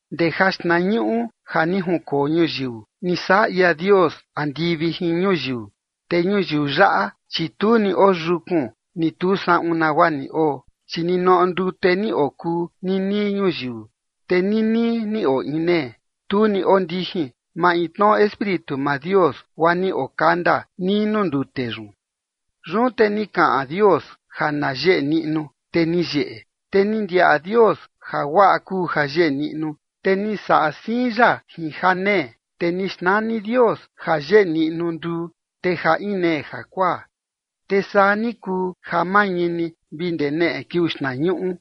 Ndee jaxtnañuꞌu ja ni junkoo ñuyiu, ni saꞌa ia Dios andivi jin ñuyiu. Te ñuyiu yaꞌa, chi tu ni oyukun, ni tu saꞌun nagua ni oo, chi ninoꞌo ndute ni okuu nii nii ñuyiu, te nii nii ni oo inee, tu ni ondijin maintnoꞌo Espíritu maa Dios, guaa ni okanda nii nuu ndute yun. Yun te ni kaꞌan Dios: “Ja na yeꞌe niꞌnu”. Te ni yeꞌe. Te ni ndiaꞌa Dios ja guaꞌa kuu ja yeꞌe niꞌnu, te ni saꞌa siin ya jin janee. Te ni xnani Dios jayeꞌe niꞌnu nduu, te ja inee jakuaa. Te saa ni kuu ja mañini vi ndee neꞌe kiuu xtnañuꞌu.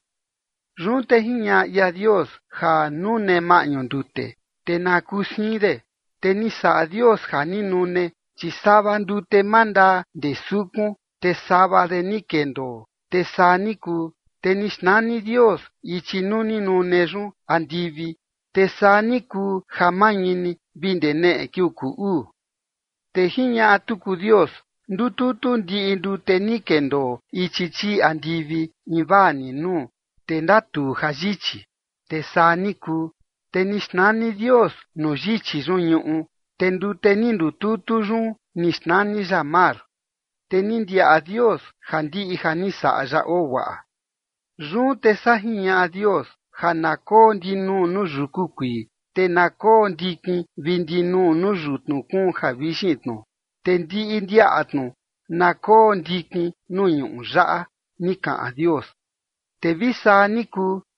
Yun te jiñaꞌa ia Dios: “Ja nune maꞌñu ndute”. Te na kuu siin de. Te ni saꞌa Dios ja ni nune, chi sava ndute mandaa ndee sukun, te sava de ni kendoo. Te saa ni kuu. Te ni xnani Dios ichi nuu ni nune yun andivi. Te saa ni kuu ja mañini vi ndee neꞌe kiuu kuu uu. Te jiñaꞌa tuku Dios: “Ndututu ndiꞌi ndute ni kendoo ichi chii andivi invaa ni nuu, te ndatuu jayichi”. Te saa ni kuu. Te ni xnani Dios nuu yichi yun ñuꞌu, te ndute ni ndututu yun ni xnani ya mar. Te ni ndiaꞌa Dios ja ndiꞌi ja ni saꞌa ya oo guaꞌa. Yun te saa jiñaꞌa Dios: “Ja na koo ndinuu nuu yuku kuii, te na koo ndikin vi ndinuu nuu yutnu kuun javixin tnu. Te ndiꞌi ndiaꞌa tnu na koo ndikin nuu ñuꞌu yaꞌa”, ni kaꞌan Dios. Te vi saa ni kuu.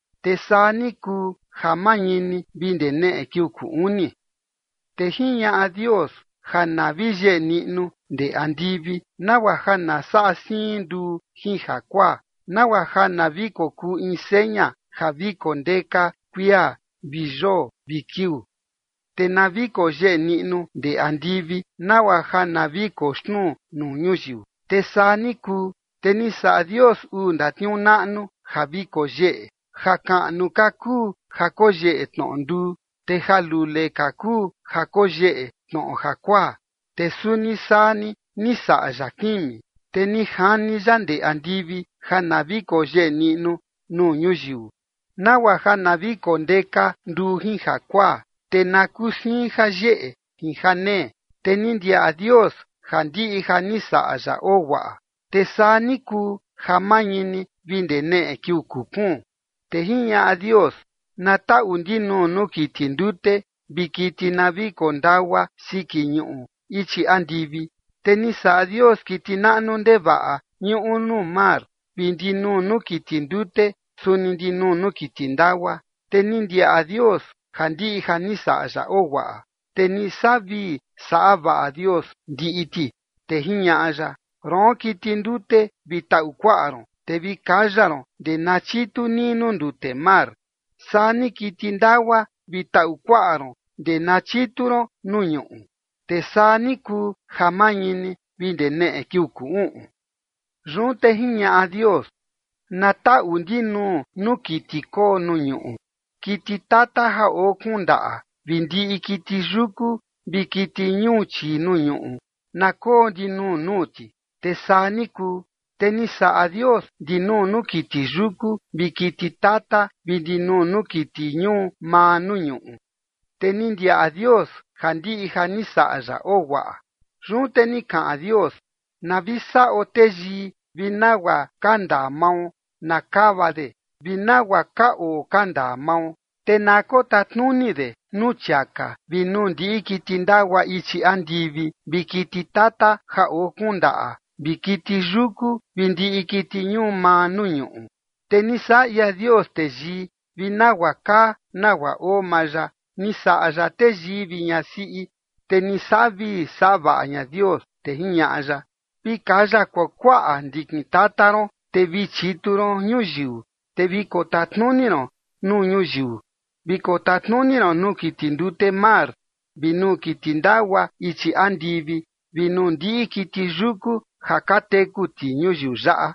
Te saa ni kuu ja mañini vi ndee neꞌe kiuu kuu uni. Te jiñaꞌa Dios: “Ja na vi yeꞌe niꞌnu ndee andivi, nagua ja na saꞌa siin nduu jin jakuaa, nagua ja na vi kokuu in seña ja vi kondeka kuia vi yoo vi kiuu. Te na vi koyeꞌe niꞌnu ndee andivi, nagua ja na vi koxnuu nuu ñuyiu”. Te saa ni kuu. Te ni saꞌa Dios uu ndatniuu naꞌnu ja vi koyeꞌe. Jakaꞌnu ka kuu ja koyeꞌe tnoꞌo nduu, te jalule ka kuu ja koyeꞌe tnoꞌo jakuaa, te suni saa ni ni saꞌa ya kimi. Te ni jani ya ndee andivi ja na vi koyeꞌe niꞌnu nuu ñuyiu, nagua ja na vi kondeka nduu jin jakuaa, te na kuu siin jayeꞌe jin janee. Te ni ndiaꞌa Dios ja ndiꞌi ja ni saꞌa ya oo guaꞌa. Te saa ni kuu ja mañini vi ndee neꞌe kiuu kuu kuun. Te jiñaꞌa Dios: “Na taꞌu ndinuu nuu kiti ndute vi kiti na vi kondagua siki ñuꞌu ichi andivi”. Te ni saꞌa Dios kiti naꞌnu ndevaꞌa ñuꞌu nuu mar vi ndinuu nuu kiti ndute suni ndinuu nuu kiti ndagua. Te ni ndiaꞌa Dios ja ndiꞌi ja ni saꞌa ya oo guaꞌa. Te ni saꞌa vii saꞌa vaꞌa Dios ndiꞌi ti, te jiñaꞌa ya: ―Roon kiti ndute, vi taꞌu kuaꞌa ron, te vi kaya ron ndee na chitu nii nuu ndute mar, saa ni kiti ndagua, vi taꞌu kuaꞌa ron ndee na chitu ron nuu ñuꞌu. Te saa ni kuu ja mañini vi ndee neꞌe kiuu kuu uꞌun. Yun te jiñaꞌa Dios: “Na taꞌu ndinuu nuu kiti koo nuu ñuꞌu, kiti tata ja oo kuun ndaꞌa vi ndiꞌi kiti yuku vi kiti ñuu chii nuu ñuꞌu na koo ndinuu nuu ti”. Te saa ni kuu. Te ni saꞌa Dios ndinuu nuu kiti yuku vi kiti tata vi ndinuu nuu kiti ñuu maa nuu ñuꞌu. Te ni ndiaꞌa Dios ja ndiꞌi ja ni saꞌa ya oo guaꞌa. Yun te ni kaꞌan Dios: “Na vi saꞌo teyii vi nagua ka ndaa mao na kava de vi nagua ka oo ka ndaa mao, te na kotatnuni de nuu chiaka vi nuu ndiꞌi kiti ndagua ichi andivi vi kiti tata ja oo kuun ndaꞌa vi kiti yuku vi ndiꞌi kiti ñuu maa nuu ñuꞌu”. Te ni saꞌa ia Dios teyii vi nagua kaa nagua oo maa ya, ni saꞌa ya teyii vi ñasiꞌi. Te ni saꞌa vii saꞌa vaꞌa ña Dios, te jiñaꞌa ya: ―Vi kaya kuakuaꞌa ndikin tata ron, te vi chitu ron ñuyiu, te vi kotatnuni ron nuu ñuyiu, vi kotatnuni ron nuu kiti ndute mar vi nuu kiti ndagua ichi andivi vi nuu ndiꞌi kiti yuku ja ka teku ti ñuyiu yaꞌa.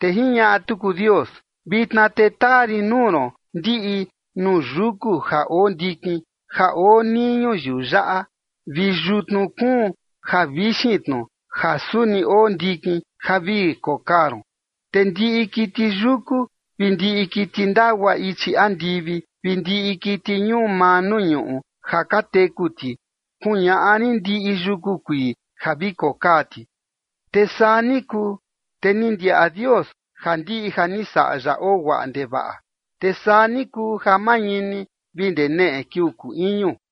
Te jiñaꞌa tuku Dios: ―Vitna te taa rin nuu ron ndiꞌi nuu yuku ja oo ndikin ja oo nii ñuyiu yaꞌa vi yutnu kuun ja vixin tnu ja suni oo ndikin ja vi kokaa ron. Te ndiꞌi kiti yuku vi ndiꞌi kiti ndagua ichi andivi vi ndiꞌi kiti ñuu maa nuu ñuꞌu ja ka teku ti kuñaꞌa rin ndiꞌi yuku kuii ja vi kokaa ti. Te saa ni kuu. Te ni ndiaꞌa Dios ja ndiꞌi ja ni saꞌa ya oo guaꞌa ndevaꞌa. Te saa ni kuu ja mañini vi ndee neꞌe kiuu kuu iñu.